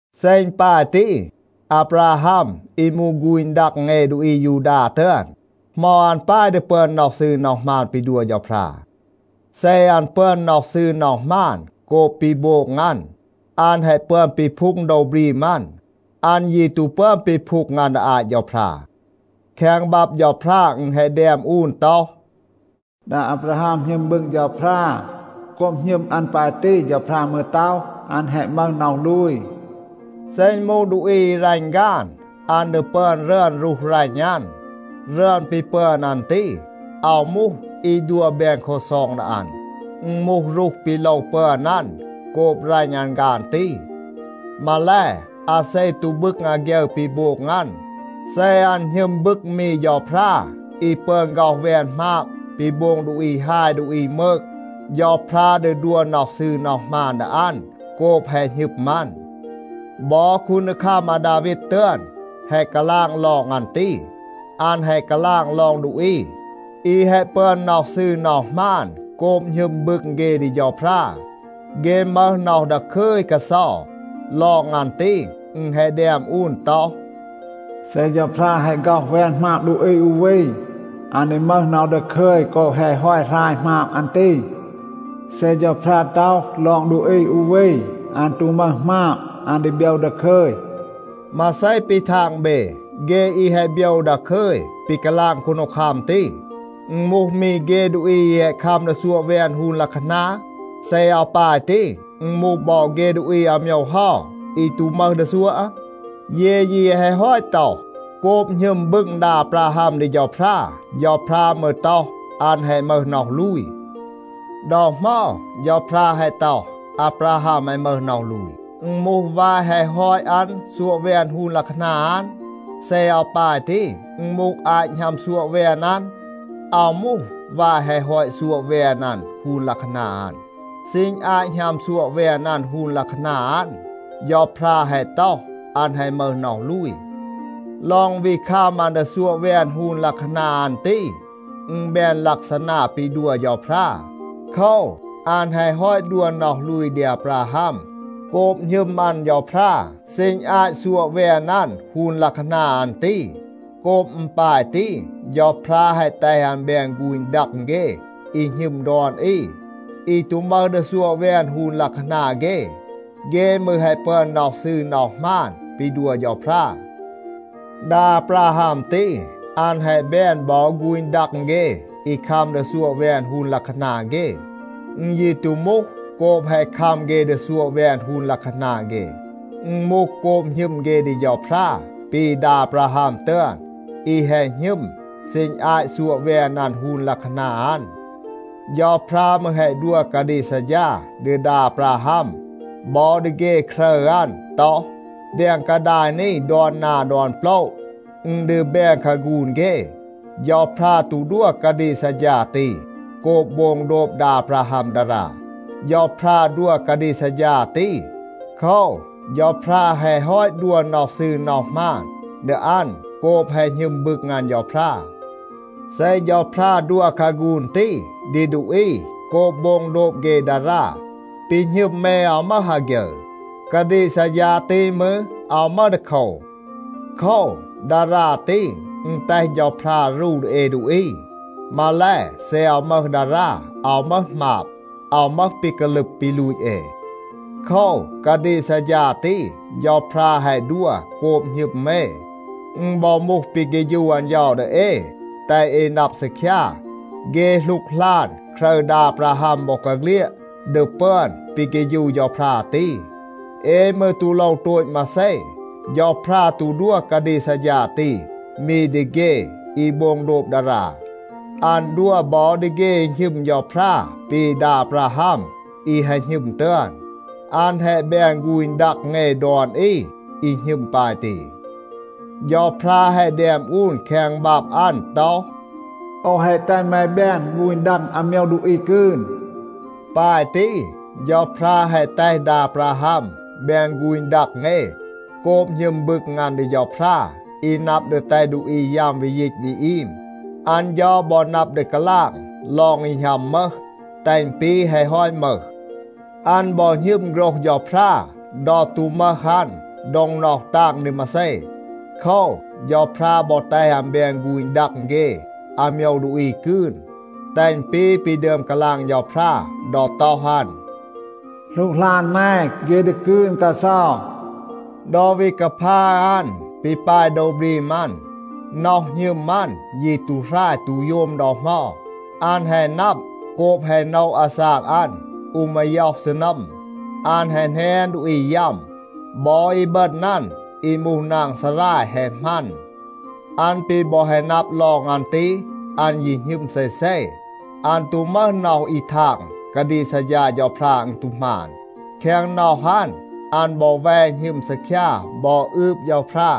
เซ อึณ ปาย ตี, อาบราฮัม อี มูห ฆูณ ดัง เอ ดูอี อายูดา ตึอน, เหมา อัน ปาย ดี ปึอน น็อห ซืร น็อห หมาน ปี ดัว เฌาพรา? เซ อัน ปึอน น็อห ซืร น็อห หมาน โกบ ปี โบง อัน, อัน แฮะ ปึอน ปีพูง โดว บรีม อัน. อัน ยี ตู ปึอน ปีพูง อัน ดี อาต เฌาพรา. แคง บับ เฌาพรา อึณ แฮะ แดม อูน ต็อห, “ดา อาบราฮัม หณึม บึง เฌาพรา. โกบ หณึม อัน ปาย ตี, เฌาพรา มืร ต็อห, อัน แฮะ มึห น็อห ลูย.” เซ อึณ มูห ดูอี อี รัณ ฆาน, อัน ดี ปึอน รึอน รูห รัณ อัน. รึอน ปี ปึอน อัน ตี, อาว มูห, อี ดัว แบน ลักซอง ดี อัน. อึณ มูห รูห ปี โลว ปึอน อัน โกบ รัณ อัน ฆาน ตี. มาแล, อาเซ ตู บึง อาฆยึร ปี โบง อัน, เซ อัน หณึม บึง มี เฌาพรา อี ปึอน ฆ็อห แวน หมาบ ปี โบง ดูอี ฮาย ดูอี มืก, เฌาพรา ดี ดัว น็อห ซืร น็อห หมาน ดี อัน โกบ แฮะ หณึม อัน. บอ คูนดีคัม อาดาวีด ตึอน แฮะ กาลาง ลอง อัน ตี. อัน แฮะ กาลาง ลอง ดูอี อี แฮะ ปึอน น็อห ซืร น็อห หมาน โกบ หณึม บึง เฆ ดี เฌาพรา, เฆ มึห น็อห ดาคึย กาเซา. ลอง อัน ตี, อึณ แฮะ แดม อูน ต็อห, “เซ เฌาพรา แฮะ ฆ็อห แวน หมาบ ดูอี อู วี, อัน ดี มึห น็อห ดาคึย โกบ แฮะ ฮอต หราย หมาบ อัน ตี. เซ เฌาพรา ต็อห ลอง ดูอี อู วี, อัน ตู มึห หมาบ, อัน ดี โบยว ดาคึย.” มาเซ ปี ทาง เบ? เฆ อี แฮะ โบยว ดาคึย ปี กาลาง คูนดีคัม ตี, อึณ มูห มี เฆ ดูอี อี แฮะ คัม ดี ซัวะ แวน ฮูน ลัะคานา? เซ อาว ปาย ตี, อึณ มูห บอ เฆ ดูอี อาโมยว เฮา อี ตู มึห ดี ซัวะ? เย ยี แฮะ ฮอต ต็อห, “โกบ หณึม บึง ดา อาบราฮัม ดี เฌาพรา, เฌาพรา มืร ต็อห, อัน แฮะ มึห น็อห ลูย.” ดอ เหมา เฌาพรา แฮะ ต็อห, อาบราฮัม แฮะ มึห น็อห ลูย? อึณ มูห วาย แฮะ ฮอต อัน ซัวะ แวน ฮูน ลัะคานา อัน? เซ อาว ปาย ตี, อึณ มูห อาต หณัม ซัวะ แวน อัน? อาว มูห วาย แฮะ ฮอต ซัวะ แวน อัน ฮูน ลัะคานา อัน. ซีณ อาต หณัม ซัวะ แวน อัน ฮูน ลัะคานา อัน, เฌาพรา แฮะ ต็อห, อัน แฮะ มึห น็อห ลูย. ลอง วี คัม อัน ดี ซัวะ แวน ฮูน ลัะคานา อัน ตี, อึณ แบน ลักซานา ปี ดัว เฌาพรา. โคว, อัน แฮะ ฮอต ดัว น็อห ลูย ดี อาบราฮัม โกบ หณึม อัน เฌาพรา ซีณ อาต ซัวะ แวน อัน ฮูน ลัะคานา อัน ตี. โกบ อึณ ปาย ตี, เฌาพรา แฮะ แตห อัน แบน ฆูณ ดัง เฆ อี หณึม ดอน อี, อี ตู มึห ดี ซัวะ แวน ฮูน ลัะคานา เฆ. เฆ มืร แฮะ ปึอน น็อห ซืร น็อห หมาน ปี ดัว เฌาพรา. ดา อาบราฮัม ตี, อัน แฮะ แบน บอ ฆูณ ดัง เฆ อี คัม ดี ซัวะ แวน ฮูน ลัะคานา เฆ. อึณ ยี ตู มูห โกบ แฮะ คัม เฆ ดี ซัวะ แวน ฮูน ลัะคานา เฆ. อึณ มูห โกบ หณึม เฆ ดี เฌาพรา ปี ดา อาบราฮัม ตึอน อี แฮะ หณึม ซีณ อาต ซัวะ แวน อัน ฮูน ลัะคานา อัน. เฌาพรา มืร แฮะ ดัว กาดีก ซัดฌา ดี ดา อาบราฮัม บอ ดี เฆ ครึร อัน ต็อห, แดง กาดาย นี ดอน นา ดอน โปละ, อึณ ดี แบน คาฆูน เฆ. เฌาพรา ตู ดัว กาดีก ซัดฌา ตี โกบ โบง โดบ ดา อาบราฮัม ดารา. เฌาพรา ดัว กาดีก ซัดฌา ตี โคว, เฌาพรา แฮะ ฮอต ดัว น็อห ซืร น็อห หมาน ดี อัน โกบ แฮะ หณึม บึง อัน เฌาพรา. เซ เฌาพรา ดัว คาฆูน ตี ดี ดูอี โกบ โบง โดบ เฆ ดารา, ปี หณึม เอ อาว มึห อาฆยึร. กาดีก ซัดฌา ตี มืร, อาว มึห ดีโคว. โคว, ดารา ตี, อึณ แตห เฌาพรา รู ดี เอ ดูอี. มาแล, เซ อาว มึห ดารา, อาว มึห หมาบ, อาว มึห ปี กาลึบ ปี ลูต เอ. โคว, กาดีก ซัดฌา ตี, เฌาพรา แฮะ ดัว โกบ หณึม เอ. อึณ บอ มูห ปี เฆฌู อัน เฌา ดี เอ, แตห เอ นับ ซีคยา, เฆ หลูกหลาน ครึร ดา อาบราฮัม บอกาเฆลียด ดี ปึอน ปี เฆฌู เฌาพรา ตี. เอ มืร ตู โลว โตต มาเซ. เฌาพรา ตู ดัว กาดีก ซัดฌา ตี มี ดี เฆ อี โบง โดบ ดารา. อัน ดัว บอ ดี เฆ อี หณึม เฌาพรา ปี ดา อาบราฮัม อี แฮะ หณึม ตึอน. อัน แฮะ แบน ฆูณ ดัง เอ ดอน อี อี หณึม ปาย ตี. เฌาพรา แฮะ แดม อูน แคง บับ อัน ต็อห, “โอว แฮะ แตห แม แบน ฆูณ ดัง อาโมยว ดูอี กืน.” ปาย ตี, เฌาพรา แฮะ แตห ดา อาบราฮัม แบน ฆูณ ดัง เอ โกบ หณึม บึง อัน ดี เฌาพรา อี นับ ดี แตห ดูอี ยัม วี ยีต วี อีม. อัน เฌา บอ นับ ดี กาลาง ลอง อี หณัม มึห, แตห อึณ ปี แฮะ ฮอต มึห. อัน บอ หณึม โฆรห เฌาพรา ดอ ตู มึห อัน โดง น็อห ตาง ดี มาเซ. โคว, เฌาพรา บอ แตห อัน แบน ฆูณ ดัง เฆ อาโมยว ดูอี กืน, แตห อึณ ปี ปี ดึอม กาลาง เฌาพรา ดอ ต็อห อัน, “หลูกหลาน แม, เฆ ดี กืน กาเซา.” ดอ วี กาพา อัน ปี ปาย โดว บรีม อัน, น็อห หณึม อัน ยี ตู หราย ตู โยม ดอ เหมา. อัน แฮะ นับ, โกบ แฮะ โนะ อาซาก อัน อู มาย็อห ซีนัม, อัน แฮะ แหนน ดูอี ยัม. บอ อีบึณ อัน อี มูห นาง ซาราย แฮะ หมัน. อัน ปี บอ แฮะ นับ ลอง อัน ตี, อัน ยี หณึม เซเซ. อัน ตู มึห น็อห อี ทาง, กาดีก ซัดฌา เฌาพรา อึณ ตู หมาน. แคง น็อห อัน, อัน บอ แว หณึม ซีคยา บอ อืบ เฌาพรา.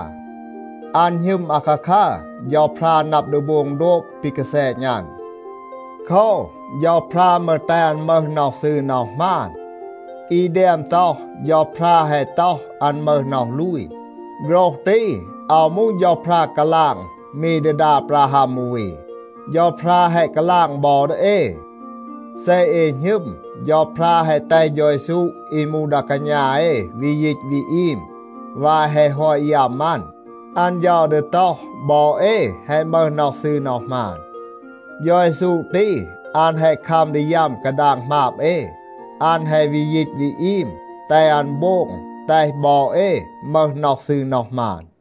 อัน หณึม อาคาคัร, เฌาพรา นับ ดี โบง โดบ ปี กาแซณ อัน. โคว, เฌาพรา มืร แตห อัน มึห น็อห ซืร น็อห หมาน. อี แดม ต็อห, “เฌาพรา แฮะ ต็อห, อัน มึห น็อห ลูย” โฆรห ตี, อาว มูห เฌาพรา กาลาง มี ดี ดา อาบราฮัม อู วี. เฌาพรา แฮะ กาลาง บอ ดี เอ. เซ เอ หณึม, เฌาพรา แฮะ แตห เฌา เยซู อี มูห ดา กาณา เอ วี ยีต วี อีม วาย แฮะ ฮอต ยัม อัน, อัน เฌา ดี ต็อห, บอ เอ แฮะ มึห น็อห ซืร น็อห หมาน. เฌา เยซู ตี, อัน แฮะ คัม ดี ยัม กาดาง หมาบ เอ. อัน แฮะ วี ยีต วี อีม, แตห อัน โบง แตห บอ เอ มึห น็อห ซืร น็อห หมาน.